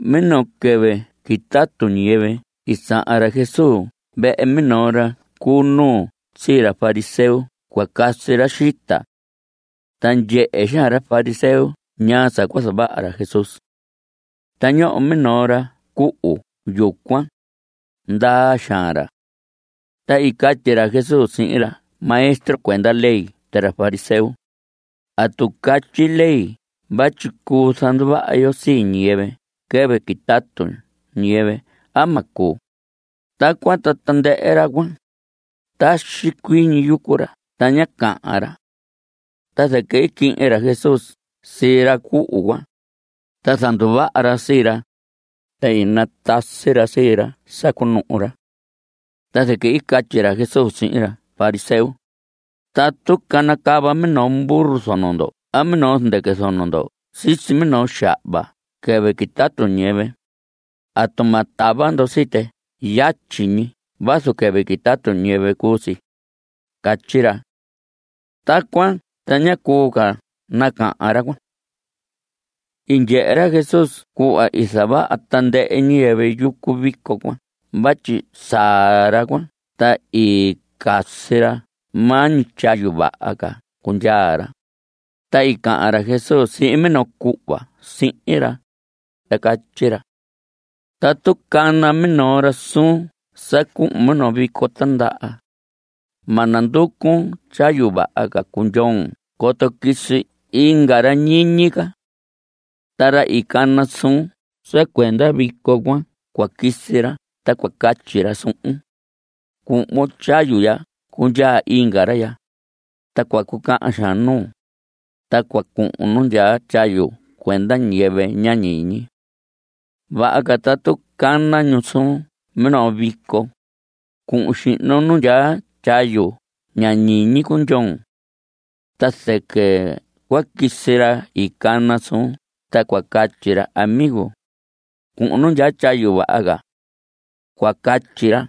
Minoo quɨvɨ quitatu ñiyɨvɨ i sahan ra Jesús vehe minoo ra cu nuu sii ra fariseo cua casi ra xita. Ta ndyehe xaan ra fariseo ñaa sa cua zavaha ra Jesús. Ta ñoho minoo ra cuhu yucuan; ndaa xaan ra. Ta i catyi ra Jesús sihin ra maestro cuenda ley ta ra fariseo: ¿Atu catyi ley vatyi cuu zanduvaha yo sii ñiyɨvɨ quɨvɨ quitatu ñiyɨvɨ a ma cuu? Tacuan ta tandɨhɨ ra cuan, taxi cuii ñi yucu ra ta ña cahan ra. Ta zɨquɨ i quihin ra Jesús sii ra cuhu cuan, ta i zanduvaha ra sii ra, ta i natasi ra sii ra sa cunuhu ra. Ta zɨquɨ i catyi ra Jesús sihin ra fariseo: Tatu canacava minoo burro zono ndo a minoo zɨndɨquɨ zono ndo sisi minoo xahva quɨvɨ quitatu ñiyɨvɨ ¿atu ma tava ndo sii tɨ yatyi ñi vazu quɨvɨ quitatu ñiyɨvɨ cuu si? Catyi ra. Tacuan ta ña cuu ca nacahan ra cuan. I ndyehe ra Jesús cuhva i zavaha tandɨhɨ ñiyɨvɨ yucu vico cuan vatyi saa ra cuan ta i casi ra maa ñi tyayu vaha ca cundyaa ra, ta i cahan ra Jesús sihin minoo cuhva sihin ra, ta i catyi ra: Tatu cana minoo ra suun sa cuhun minoo vico tindaha, ma nanducun tyayu vaha ca cundyoon coto quisi inga ra ñiñi ca. Ta ra i cana suun sa cuenda vico cuan cua quisi ra ta cua catyi ra suhun: “Cuhvon tyayu ya cundyaa inga ra ya.” Ta cua cucahan xaan nuun, ta cua cuhun nu ndyaa tyayu cuenda ñiyɨvɨ ña ñiñi. Vaha ca tatu cana ñu suun minoo vico, cuhun xihnon nu ndyaa tyayu ña ñiñi cundyoon. Ta zɨquɨ cua quisi ra i cana suun ta cua catyi ra: “Amigo, cuhun nu ndyaa tyayu vaha ca.” Cua catyi ra.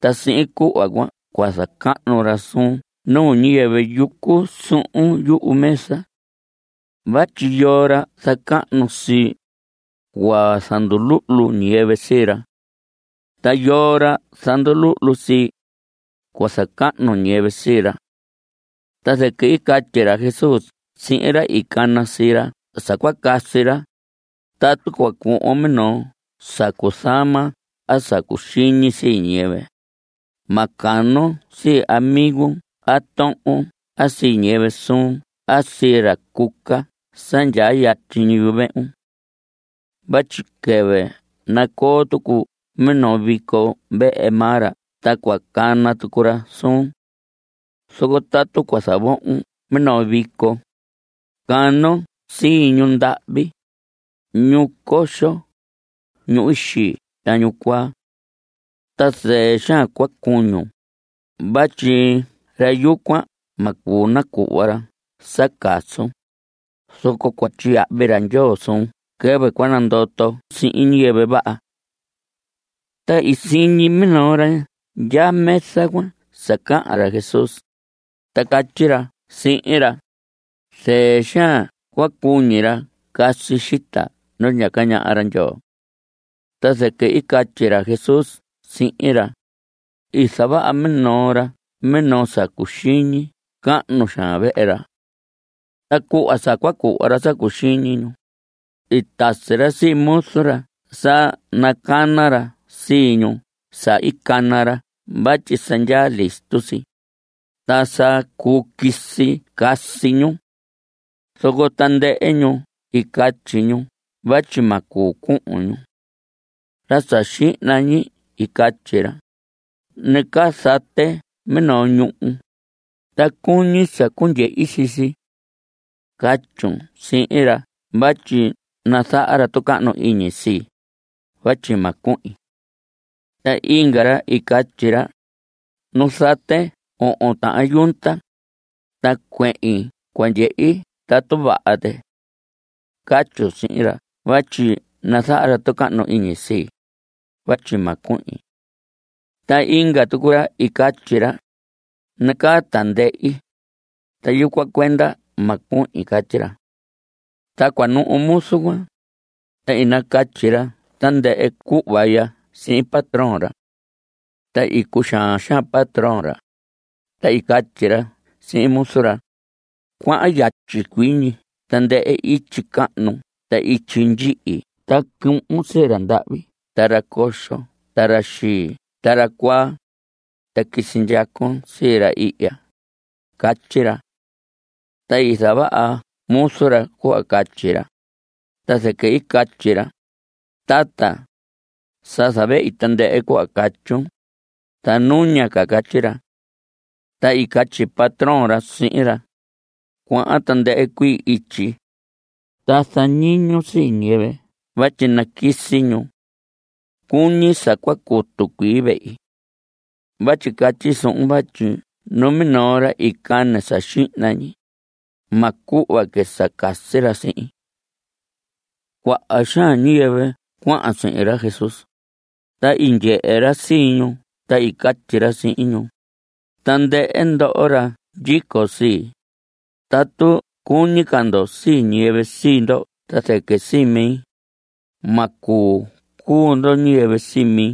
Ta sihin cuhva cuan cua zacahnu ra suun nuu ñiyɨvɨ yucu suhun yumesa. Vatyi yoo ra zacahnu sii, cua zanduluhlu ñiyɨvɨ sii ra. Ta yoo ra zanduluhlu sii, cua zacahnu ñiyɨvɨ sii ra. Ta zɨquɨ i catyi ra Jesús sihin ra i cana sii ra sa cua casi ra: Tatu cua cuhvon minoo sa cuzama a sa cuxiñi sii ñiyɨvɨ, ma canon sii amigun a tohon a sii ñiyɨvɨ suun a sii ra cuca sa ndyaa yatyi yuvehun. Vatyi quɨvɨ nacoo tucu minoo vico vehe maa ra ta cua cana tucu ra suun. Zoco tatu cua zavohon minoo vico, canon sii ñu ndahvi, ñu coxo, ñu xii ta ñu cuaa. Ta zɨɨ xaan cua cuñun. Vatyi ra yucuan ma cuu nacuhva ra sa casun, zoco cua tyiyahvi ra Ndyoo suun quɨvɨ cua nandoton sihin ñiyɨvɨ vaha. Ta siñi minoo ra ndyaa mesa cuan sa cahan ra Jesús, ta catyi ra sihin ra: Zɨɨ xaan cua cuñi ra casi xita nu ndyaca ñaha ra Ndyoo. Ta zɨquɨ i catyi ra Jesús sihin ra: I zavaha minoo ra minoo sa cuxiñi cahnu xaan vehe ra. Ta cuhva sa cua cuhva ra sa cuxiñi ñu, i tasi ra sii muzu ra sa nacana ra sii ñu sa i cana ra vatyi sa ndyaa listo si, ta sa cuu quisi casi ñu. Zoco tandɨhɨ ñu i catyi ñu vatyi ma cuu cuhun ñu. Ra sa xihna ñi i catyi ra: “Nacaa zate minoo ñuhu, ta cuñi sa cundyehi sii si. Catyun sihin ra vatyi nazaha ra tucahnu iñi sii, vatyi ma cuhin.” Ta inga ra i catyi ra: “Nu zate ohon tahan yunta, ta cuehin cua ndyehi tatu vaha tɨ. Catyun sihin ra vatyi nazaha ra tucahnu iñi sii, vatyi ma cuhin.” Ta inga tucu ra i catyi ra: “Nacaa tindehi, ta yucuan cuenda ma cuhin.” Catyi ra. Ta cua nuhu muzu cuan, ta i nacatyi ra tandɨhɨ cuhva ya sihin patrón ra. Ta i cuxaan xaan patrón ra, ta i catyi ra sihin muzu ra: “Cuahan yatyi cuii ñi tandɨhɨ ityi cahnu ta ityi ndyihi ta cuhun sii ra ndahvi ta ra coxo ta ra xii ta ra cuaa, ta quisi ndyacon sii ra ihya.” Catyi ra. Ta i zavaha muzu ra cuhva catyi ra, ta zɨquɨ i catyi ra: “Tata, sa zavehi tandɨhɨ cuhva catyun, ta nuña ca.” Catyi ra. Ta i catyi patrón ra sihin ra: “Cuahan tandɨhɨ cuii ityi, ta zañiñun sii ñiyɨvɨ vatyi naquisi ñu. Cuñi sa cua cutu cuii vehi. Vatyi catyi suhun vatyi numinoo ra i cane sa xihna ñi, ma cuhva que sa casi ra sihin.” Cuaha xaan ñiyɨvɨ cuahan sihin ra Jesús. Ta i ndyehe ra sii ñu ta i catyi ra sihin ñu: Tandɨhɨ ndoho ra ndyico sii, tatu cuñi ca ndo sii ñiyɨvɨ sii ndo ta zɨquɨ sii mi, ma cuu cuu ndo ñiyɨvɨ sii mi.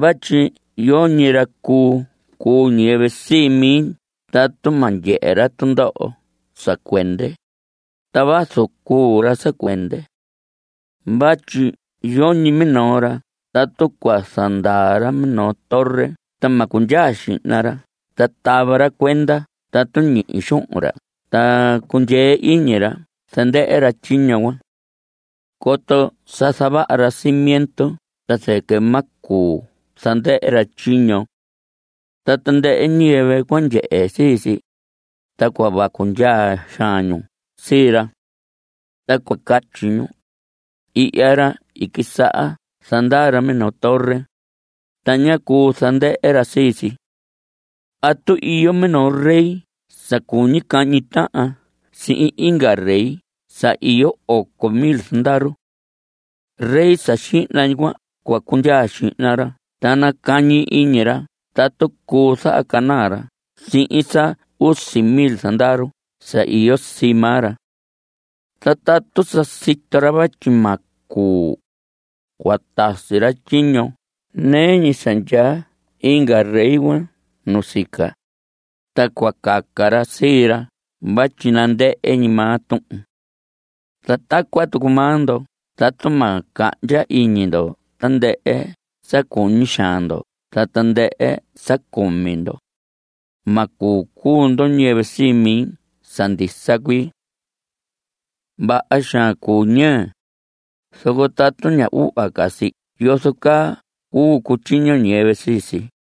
Vatyi yoñi ra cuu cuu ñiyɨvɨ sii mi tatu ma ndyehe ra tundoho sa cuende, ta vazu cuu ra sa cuende. Vatyi yoñi minoo ra tatu cua zandaa ra minoo torre ta ma cundyaa xihna ra ta tava ra cuenda tatu ñihi xuhun ra ta cundyee iñi ra zandɨhɨ ra tyiño cuan. Coto sa zavaha ra cimiento ta zɨquɨ ma cuu zandɨhɨ ra tyiño. Ta tandɨhɨ ñiyɨvɨ cua ndyehe sii si, ta cua vacu ndyaa xaan ñu sii ra. Ta cua catyi ñu: “Ihya ra i quisaha zandaa ra minoo torre, ta ñá cuu zandɨhɨ ra sii si.” A tatu iyo minoo rey sa cuñi cahñi tahan sihin inga rey sa iyo oco mil zandaru. Rey sa xihna ñi cuan cua cundyaa xihna ra ta nacañi iñi ra tatu cuu zahacanaa ra sihin sa usi mil zandaru sa iyo sii maa ra. Ta tatu sa sito ra vatyi ma cuu, cua tasi ra tyiño nɨɨ ñi sa ndyaa inga rey cuan nusica, ta cua caca ra sii ra vatyi nandɨhɨ ñi maa tuhun. Ta tacuan tucu maa ndo, tatu ma cahndya iñi ndo tandɨhɨ sa cuñi xaan ndo ta tandɨhɨ sa cumi ndo, ma cuu cuu ndo ñiyɨvɨ sii mi sa ndisa cuii. Vaha xaan cuu ñɨɨ, zoco tatu ña uhva ca si ¿yozo caa cuu cutyiño ñiyɨvɨ sii si?